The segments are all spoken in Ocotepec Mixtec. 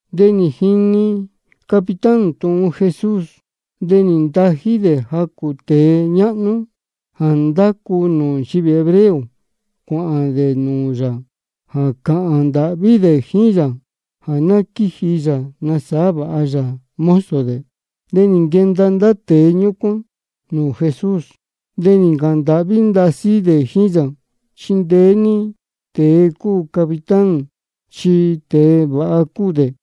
De nī jini capitán tūhun Jesús. De nī ntají dē jacū tēe ñáhnú jā ndácu nūū nchivī hebreo, cuāhān dē nūū yā jā cāhān ndāhví dē jíín yā jā ná quíji yā nasāhá vāha yā mozo dē. De nī nquenda ndá tēe ñúcuán nūū Jesús, de nī ncāhān ndāhví ndasí dē jíín yā: Chindeé ní tēe cúu capitán, chi tēe vāha cúu dē.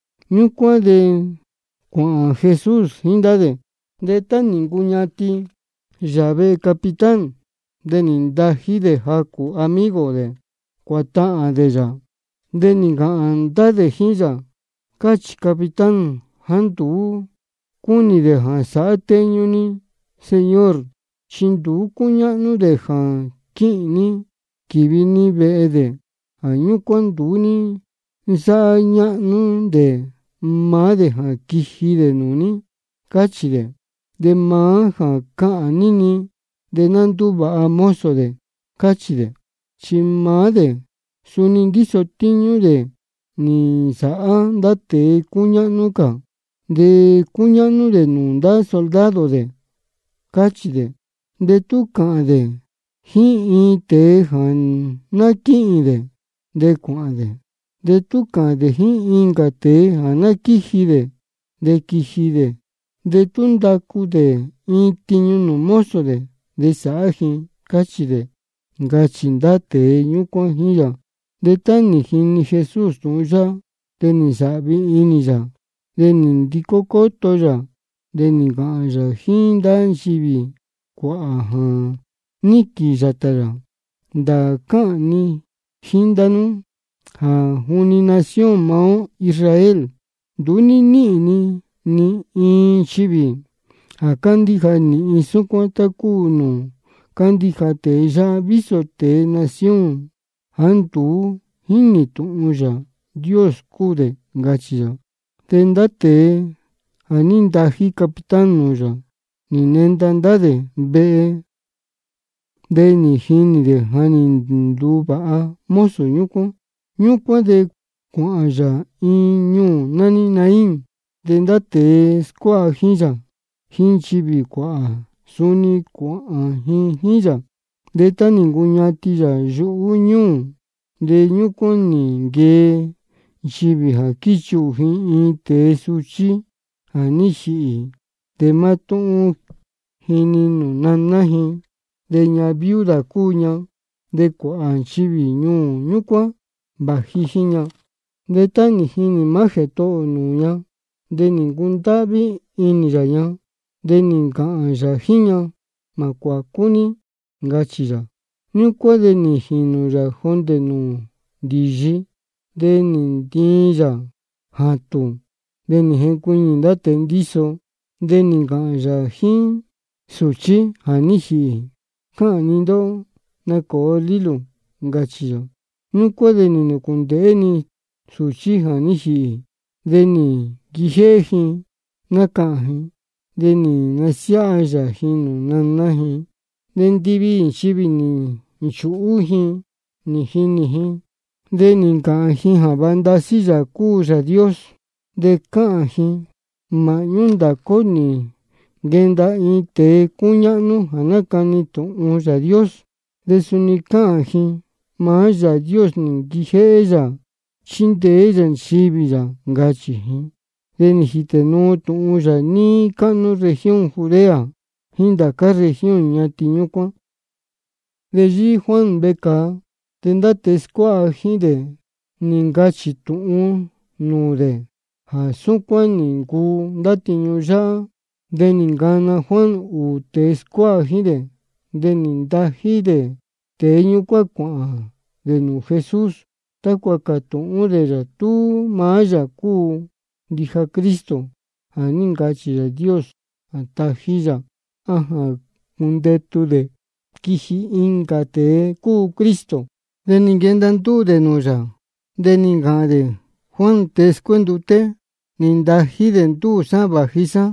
Ñúcuán de cuāhān Jesús jíín ndá dē. De tá nī ncuñatin yā vehe capitán, de nī ntají dē jacū amigo dē cuātahān dē yā. De nī ncāhān ndá dē jíín yā: Cáchī capitán jāá nduú cúnī dē jā sāhá téñú dē ní, Señor, chi nduú cúñáhnú dē jā quíhīn ní quīvi ní vehe dē. Jā ñúcuán nduú ní nsáhá ñáhnú dē maá dē jā quiji dē nūū ní, cáchī dē. De maá jā cāhān ní-ni, de ná ndúvāha mozo dē, cáchī dē. Chi maá dē suni ndíso tíñú dē nī nsāhá ndá tēe cúñáhnú cā. De cúñáhnú dē nūū ndá soldado dē, cáchī dē. De tú cāhān dē jíín iin tēe jā ná quíhīn dē, de cuāhān dē. De tú cāhān dē jíín incā tēe jā ná quíji dē, de quíji dē. De tú ndácu dē iin tiñu nūū mozo dē, de sáhá ji, cáchī dē, ncachī ndá tēe ñúcuán jíín yā. De tá nī jini Jesús tūhun yáhá, de nī nsāhvi inī yā. De nī ndicó cóto yā, de nī ncāhān yā jíín ndá nchivī cuāhā jā níquīn yātā yā: Ndāā cáhān ni jíín ndá nú jā juni nación maá ó Israel, nduú ní níhīn ni ni iin nchivī jā cándíja nīhin súcuán, tá cúu nūū cándíja tēe yáhá, vísō tēe nación jāá nduú jínī tūhun Yāā Dios cúu dē, ncachī yā. De ndá tēe jā ní ntají capitán nūū yā, nī nenda ndá dē vehe, de nī jinī dē ja nī nduvāha mozo ñúcuán. Ñúcuán de cuāhān yā iin ñuū nání Naín. De ndá tēe scuáha jíín yā, jíín nchivī cuāhā, suni cuāhān ji jíín yā. De tá nī ncuñatin yā yuhú ñúū, de ñúcuán nī nquee nchivī jā quíchuhū ji iin tēe suchí jā ní jīhī. De mátúhún ji-ni nūū naná ji, de ñahan viuda cúu ña. De cuāhā nchivī ñuū ñúcuán vāji jíín ña. De tá nī jinī maá Jētohō ō nūū ña, de nī ncundáhví inī yā ña, de nī ncāhān yā jíín ña: Mā cuācú ní, ncachī yā. Ñúcuán de nī jīnū yā jondē nūū ndīyi, de nī ntiin yā jātūn. De nī jencuiñī ndá tēe ndíso. De nī ncāhān yā jíín sūchí jā ní jīhī: Cáhān ni ndóhó, nacōo lílū, ncachī yā. Ñúcuán de nī nūcundeē-ni sūchí jā ní jīhī, de nī nquijéhé ji nácahān ji. De nī nasiáha yā ji nūū naná ji. De ndiviī nchivī nī nchūhú ji nī jinī ji, de nī ncāhān ji jā vāha ndasí Yāā cúu Yāā Dios. De cáhān ji: Māhñú ndācá ó nī nquenda iin tēe cúñáhnú jā nácani tūhun Yāā Dios. De suni cáhān ji: Maá Yāā Dios nī nquijéhé yā chíndeé yā nchivī yā, ncachī ji. De nī jītē nuu tūhun yā níí cáhnú región Judea jíín ndācá región ñatin ñúcuán. De yíhí Juan vecāa, de ndá tēe scuáha jíín dē nī ncachī tūhun nūū dē jā súcuán nī ncuu ndá tiñu yáhá. De nī ncana Juan ūū tēe scuáha jíín dē, de nī ntají dē tēe ñúcuán cuāhān dē nūū Jesús, tácua cātūhún dē yā tú maá yā cúu ndija Cristo jā ní ncachī Yāā Dios jā tají yā, á jā cundetu dē quiji incā tēe cuu Cristo. De nī nquenda ndúū dē nūū yā, de nī ncāhān dē: Juan tēe scuénduté nī ntají dē ndúū sá vāji sá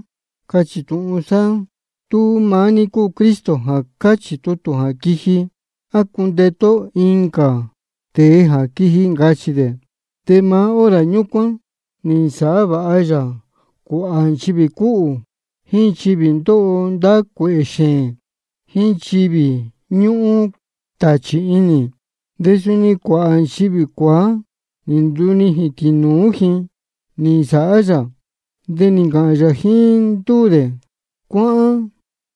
cātūhún sá ní tú maá ní cúu Cristo jā cáchī tutū jā quiji, á cundetu ó incā tēe jā quiji, ncachī dē. De maá hora ñúcuán nī nasāhá vāha yā cuāhā nchivī cúhū, jíín nchivī ndóho ndá cuēhē xēēn, jíín nchivī ñúhún tāchī inī. De suni cuāhā nchivī cuāá, nī ndunijīn tīnūú ji nī nsāhá yā. De nī ncāhān yā jíín ndúū dē: Cuáhán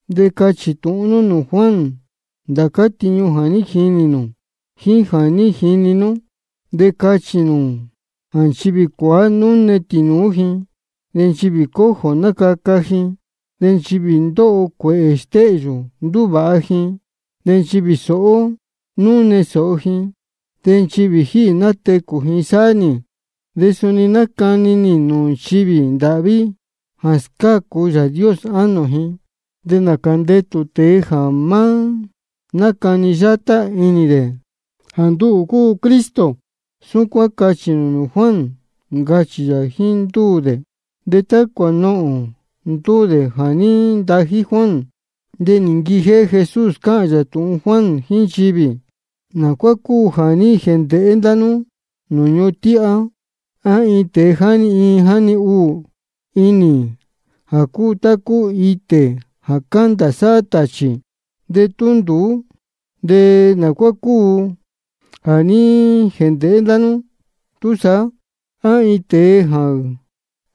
de cachī tūhun nú nūū Juan ndācá tiñu jā ní jinī nū jíín jā ní jini nú. De cachī nū jā nchivī cuāá núne tīnūú ji, de nchivī cojo nácaca ji, de nchivī ndóho cuēhē stéhyū ndúvāha ji, de nchivī sōhó núne sōho ji, de nchivī jíhī nátecū ji sáhá nī. De suni nácani nī tūhun nūū nchivī ndāhví jā scácu Yāā Dios ánō ji. De nācā ndetū tēe jā má nácani yátá inī dē jā nduhū cúu Cristo. Súcuán cachī nū nūū Juan, ncachī yā jíín ndúū dē. De tá cuānohōn ndúū tēe jā ní ntají Juan, de nī nquijéhé Jesús cáhān yā tūhun Juan jíín nchivī: ¿Nā cuá cúu jā ní jēndēhé ndá nú nūū ñuhun tíhá? ¿A iin tēe jáni iin jáni ūū inī jā cúu tá cúu itē jā cándā sáhá tāchī? De tú nduú, ¿de nā cuá cúu jā ní jēndēhé ndá nú túsaá? ¿A iin tēe jā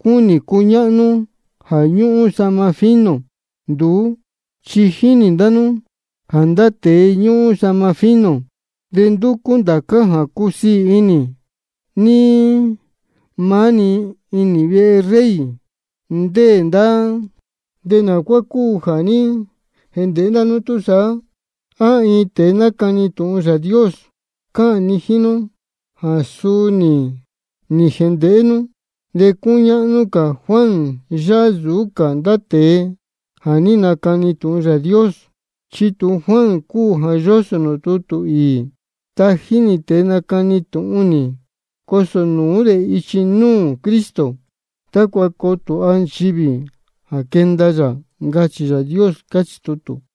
cúnī cuñáhnú jā ñúhún sahma fino? Nduú, chi jínī ndá nú jā ndá tēe ñúhún sahma fino de ndúcú ndācá jā cúsiī inī, níí maá-ni inī vehe rey ndéē ndá dē. ¿De nā cuá cúu jā ní jēndēhé ndá nú túsaá? ¿A iin tēe nácani tūhun Yāā Dios? Cáhān ni jíín nú jā suu nī jēndēhé nú. De cúñáhnú cā Juan yáhá nsūú cā ndá cā tēe jā ní nacani tūhun Yāā Dios. Chi tūhun Juan cúu jā yósō nūū tutū īī: Tají nī tēe nacani tūhun nī, cosō nūú dē ichi núū Cristo, tácua coo tūha nchivī jā quenda yā. Ncachī Yāā Dios, cáchī tutū.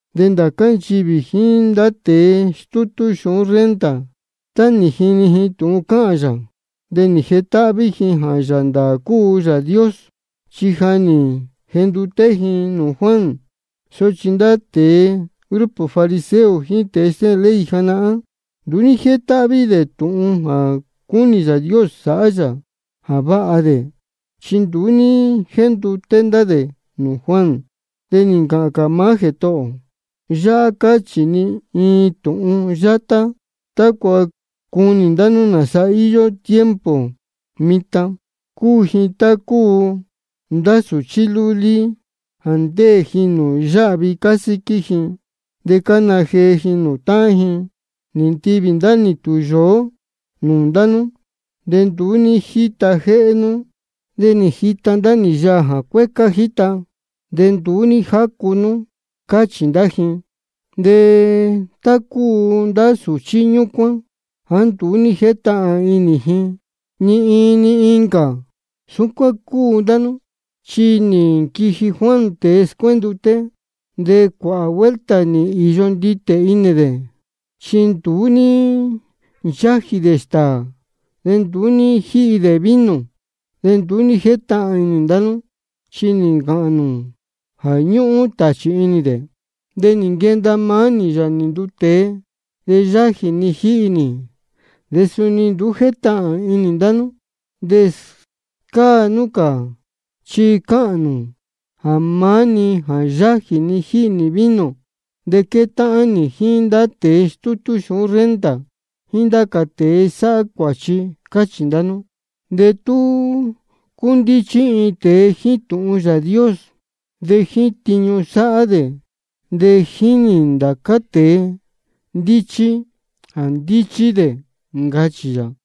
De ndācá nchivī jíín ndá tēe stútú xūhún renta, tá nī jini ji tūhun cáhān yā, de nī jetáhví ji jā Yāā ndāā cúu Yāā Dios, chi ja nī jenduté ji nūū Juan. Sochi ndá tēe grupo fariseo jíín tēe stéhēn ley janahán, nduú ní jétáhví dē tūhun jā cúnī Yāā Dios sāhá yā jā váha dē, chi nduú ní jénduté ndá dē nūū Juan. De nī ncāhān cā maá Jētohō ō: Yáhá cáchī ni iin tūhun yátá tácua cunī ndá nú nāsa íyó nchivī tiempo mitan. Cúu ji tá cúu ndá sūchí lúlí jā ndéē ji nūū yáhvi cásíquí ji. De cána jee ji nūū táhán ji: Nī ntivī ndá nī tūyōó nūū ndá nú, de nduú ní jíta jéhé nú. De nī jita ndá nī yaā jā cuécá jíta, de nduú ní jácu nú, cáchī ndá ji. De tá cúu ndá sūchí ñúcuán jāá nduú ní jétahān inī ji ni iin ni incā, súcuán cúu ndá nú. Chi nī nquiji Juan tēe scuénduté, de cuāhā vuelta nī īyo nditē inī dē, chi nduú ní nchájī dē stāā de nduú ní jíhi dē vino. De nduú ní jétahān inī ndá nú, chi nī ncāhān nū jā ñúhún tāchī inī dē. De nī nquenda maá nī, Yāā nī nduu tēe, de yájī ni jíhi nī, de suni nduú jétahān inī ndá nú, de scáa nú cā chi cáhān nū jā maá-ni jā yájī ni jíhi nī vino. De quétáhán nī jíín ndá tēe stútú xūhún renta jíín ndá cā tēe sáhá cuāchi, cáchī ndá nú. De tú cúndíchí iin tēe jíín tūhun Yāā Dios, de jíín tiñu sáhá dē de jínī ndá cā tēe ndíchí jā ndíchí dē, ncachī yā.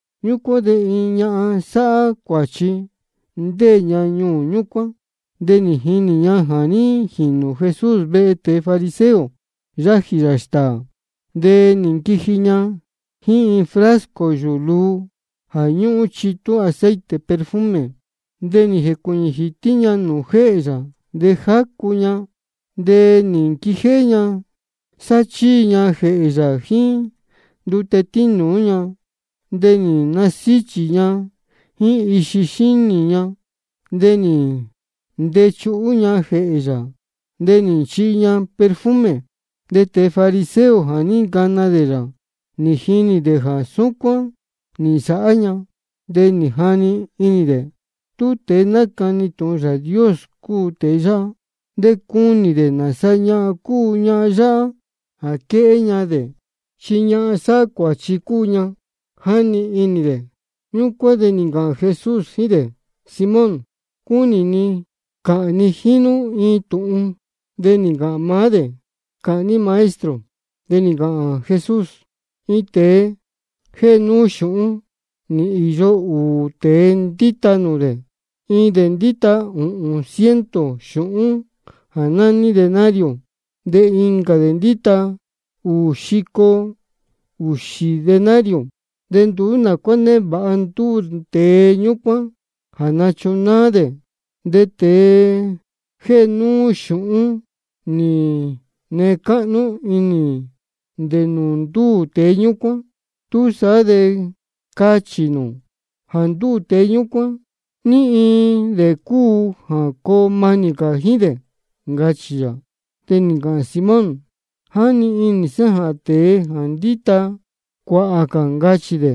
Ñúcuán de iin ñahan sáhá cuāchi, ndéē ña ñuū ñúcuán, de nī jinī ña jā ní jīnū Jesús vehe tēe fariseo, yájī yā stāā. De nī nquiji ña jíín iin frasco yūū luu jā ñúhún chitú aceite perfume. De nī jēcuīñī jītí ña nūū jéhē yā, de jácu ña. De nī nquijéhé ña sáchíi ña jēhē yā jíín ndute tínūú ña, de nī nasíchī ña jíín ixi xínī ña. De nī ntechuhú ña jēhē yā, de nī nchihi ña perfume. De tēe fariseo jā ní ncana dē yā, nī jinī dē jā súcuán nī nsāhá ña, de nī jani inī dē: Tú tēe nácani tūhun Yāā Dios cúu tēe yáhá, de cunī dē nāsa ñahan cúu ñahan yáhá jā quéhé ña dē, chi ñahan sáhá cuāchi cúu ña, jáni inī dē. Ñúcuán de nī ncāhān Jesús jíín dē: Simón, cúnī ni cāhān ni jíín nú iin tūhun. De nī ncāhān maá dē: Cāhān ní Maestro. De nī ncāhān Jesús: Iin tēe jéhe núú xūhún, nī īyo ūū tēe ndíta nūū dē. Iin dē ndíta ūhūn ciento xūhún jā nání denario, de incā dē ndíta ūū xico ūxī denario. De nduú nā cuá névāha ndúū tēe ñúcuán jā nachunáá dē. De tēe jéhe núú xūhún nī nee cáhnú inī dē nūū ndúū tēe ñúcuán. Túsaá de cachī nū: Jā ndúū tēe ñúcuán, ¿ní iin dē cúu jā coo manī cā jíín dē? ncachī yā. De nī ncāhān Simón: Jáni inī sá jā tēe nī ndita cuāhā cā, ncachī dē.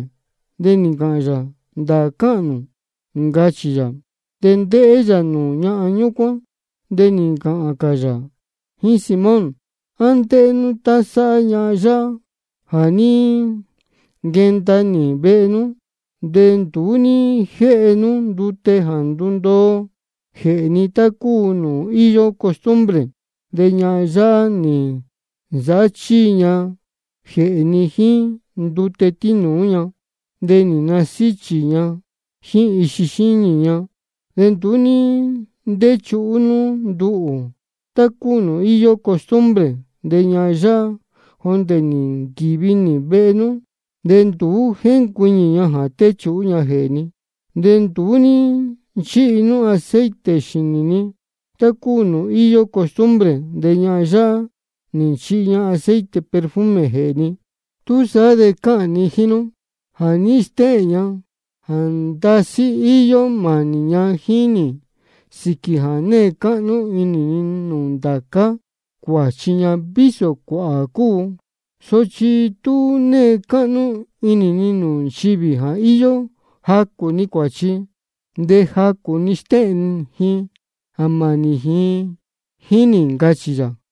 De nī ncāhān yā: Ndāā cáhān nū, ncachī yā. De ndéhé yā nūū ñahan ñúcuán, de nī ncāhān cā yā jíín Simón: ¿A ndéhé nú tá sáhá ñahan yáhá? Jā ní nquenda nī vehe nú, de nduú ní jéhe nú ndute jā ndundoo jēhē ni, tá cúu nūū íyó costumbre. De ñahan yáhá nī nsāhá chíi ña jēhē ni jíín ndute tínūú ña, de nī nasíchī ña jíín ixi xínī ña. De nduú ní ntéchuhú nú nduhū, tá cúu nūū íyó costumbre. De ñahan yáhá, jondē nī nquīvi nī vehe nú, de nduú jéncuiñī ña jā téchuhú ña jēhē ni. De nduú ní nchíhi nú aceite xīnī ni, tá cúu nūū íyó costumbre. De ñahan yáhá nī nchihi ña aceite perfume jēhē ni. Túsaá de cáhān ni jíín nú jā ní stéhēn ña jā ndasí íyó mānī ña jíín nī sīquī jā née cáhnú inī ni nūū ndācá cuāchi ña, vísō cuāhā cúu. Sochi tú née cáhnú inī ni nūū nchivī jā íyó jacū-ni cuāchi, de jacū-ni stéhēn ji jā mānī ji jíín nī, ncachī yā.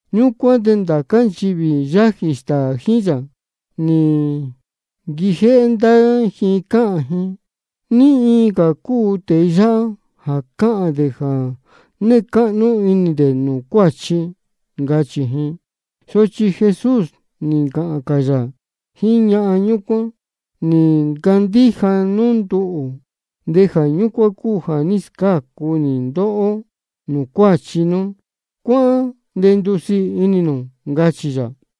Ñúcuán de ndá nchivī yájī stāā jíín yā, nī nquijéhé ndá ji cáhān ji: ¿Ní iin cā cúu tēe yáhá jā cáhān dē jā née cáhnú inī dē nūū cuáchi? ncachī ji. Sochi Jesús nī ncāhān cā yā jíín ñahan ñúcuán: Nī ncandíja nú nduhū, de jā ñúcuán cúu jā ní scácu nī ndóhó nūū cuáchi nú. Cuáhán de ndusiī inī nū, ncachī yā.